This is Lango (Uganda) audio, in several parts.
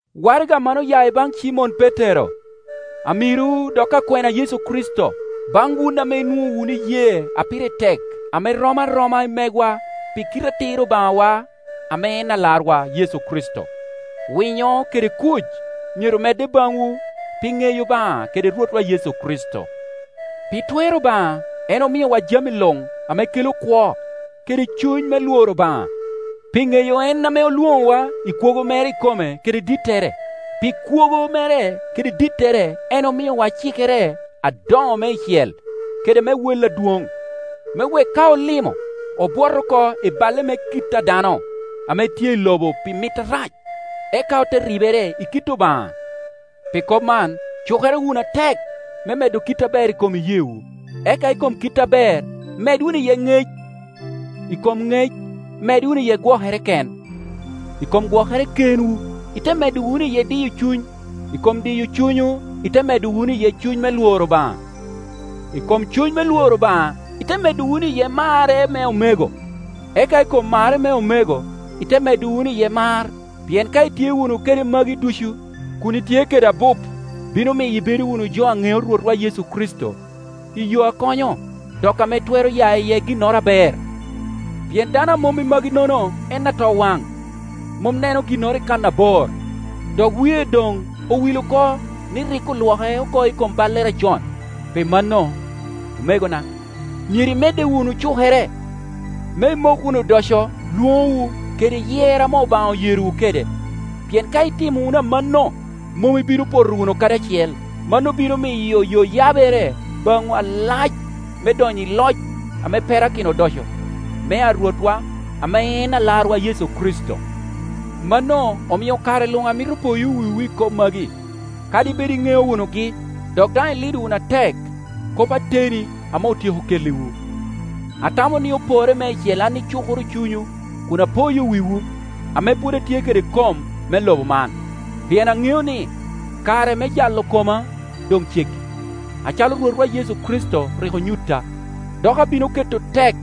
Waraga man oya ibaŋ Cimon Petero, amiro dok akwena a Yecu Kricito. Baŋ wun ame inwoŋo wunu iyee a pire tek ame rom aroma i megwa pi kite atir Obaŋawa ame en Alarwa, Yecu Kricito: Winyo kede kuc myero medde baŋwu pi ŋeyo Obaŋa kede Rwotwa Yecu Kricito. Pi twer Obaŋa en omiowa jami luŋ ame kelo kwo kede cuny me lworo Obaŋa, pi ŋeyo en ame olwoŋowa i kwogo mere ikome kede dittere. Pi kwogo mere kede dittere en omiowa cikere adoŋo meicel kede me wel adwoŋ, me wek ka olimo, obwot oko i balle me kit a dano ame tye i lobo pi mit arac, eka ote ribere i kit Obaŋa. Pi kop man, cukere wunu atek me medo kit aber i kom iyeewu; eka i kom kit aber med wunu iye ŋec; i kom ŋec med wunu iye gwokere ken; i kom gwokere kenwu ite medo wunu iye diyo cuny; i kom diyo cunywu ite medo wunu iye cuny me lworo Obaŋa; i kom cuny me lworo Obaŋa ite medo wunu iye marre me omego; eka i kom marre me omego ite medo wunu iye mar. Pien ka itye wunu kede magi ducu, kun itye kede abup, bino miyo ibedo wunu jo a ŋeo Rwotwa Yecu Kricito i yo a konyo, dok ame twero ya iye ginnoro aber. Pien dano a mom i maginogo en atowaŋ, mom neno ginnoro i kannabor, dok wie doŋ owil oko ni rik olwoke oko i kom ballere acon. Pi mano, omegona, myero imedde wunu cukere, me imok wunu odoco lwoŋowu, kede yer ame Obaŋa oyerowu kede; pien ka itimo wunu amanno, mom ibino poto wunu kadi acel. Mano bino miyo yo yabere baŋwu alac me donyo i loc ame perakino odoco mea Rwotwa ame en Alarwa Yecu Kricito. Mano omio kare luŋ amito poyo wiwu i kop magi, kadi bed iŋeo wunugi, dok daŋ ilido wunu atek kop ateni ame otyeko kelliwu. Atamo ni oporre meicel an icukoro cunywu kun apoyo wiwu, ame pwod atye kede kom me lobo man; pien aŋeo ni, kare me jalo koma doŋ ceggi, acalo Rwotwa Yecu Kricito rik onyutta. Dok abino keto tek,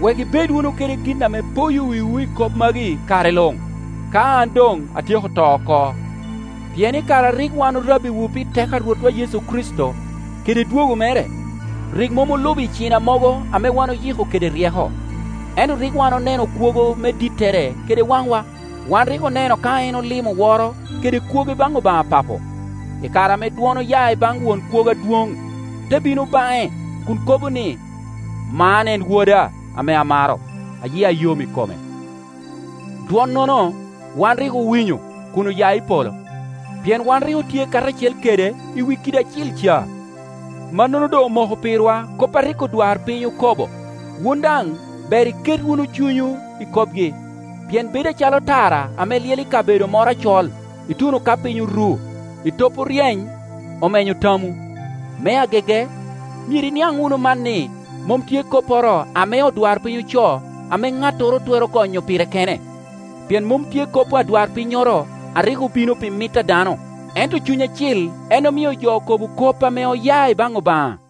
wek ibed wunu kede gin ame poyo wiwu i kop magi kare luŋ, ka an doŋ atyeko to oko. Pien i kare a rik wan orabbiwu pi teko a Rwotwa Yecu Kricito, kede dwogo mere, rik mom olubo icina mogo ame wan oyiko kede ryeko, ento rik wan oneno kwogo me dittere kede waŋwa. Wan rik oneno ka en olimo woro kede kwogo i baŋ Obaŋa Papo, i kare ame dwon oya i baŋ Won Kwogo Adwoŋ, te bino baŋe kun kobo ni, “Man en Woda ame amaro, a yia yom i kome.” Dwonnono wan rik owinyo kun oya i polo, pien wan rik otye karacel kede i wi kidi acil ca. Mannono doŋ omoko pirwa kop a rik odwarpiny okobo. Wun daŋ ber iket wunu cunywu i kopgi, pien bedo acalo tara ame lyel i kabedo moro acol, ituno ka piny oru, etop oryeny, omenyo tamwu. Me agege, myero iniaŋ wunu man ni, mom tye kopporo ame odwarpiny ocoo ame ŋattoro twero gonyo pire kene; pien mom tye kop adwarpinnyoro a rik obino pi mit a dano, ento Cuny Acil en omio jo okobo kop ame oya i baŋ Obaŋa.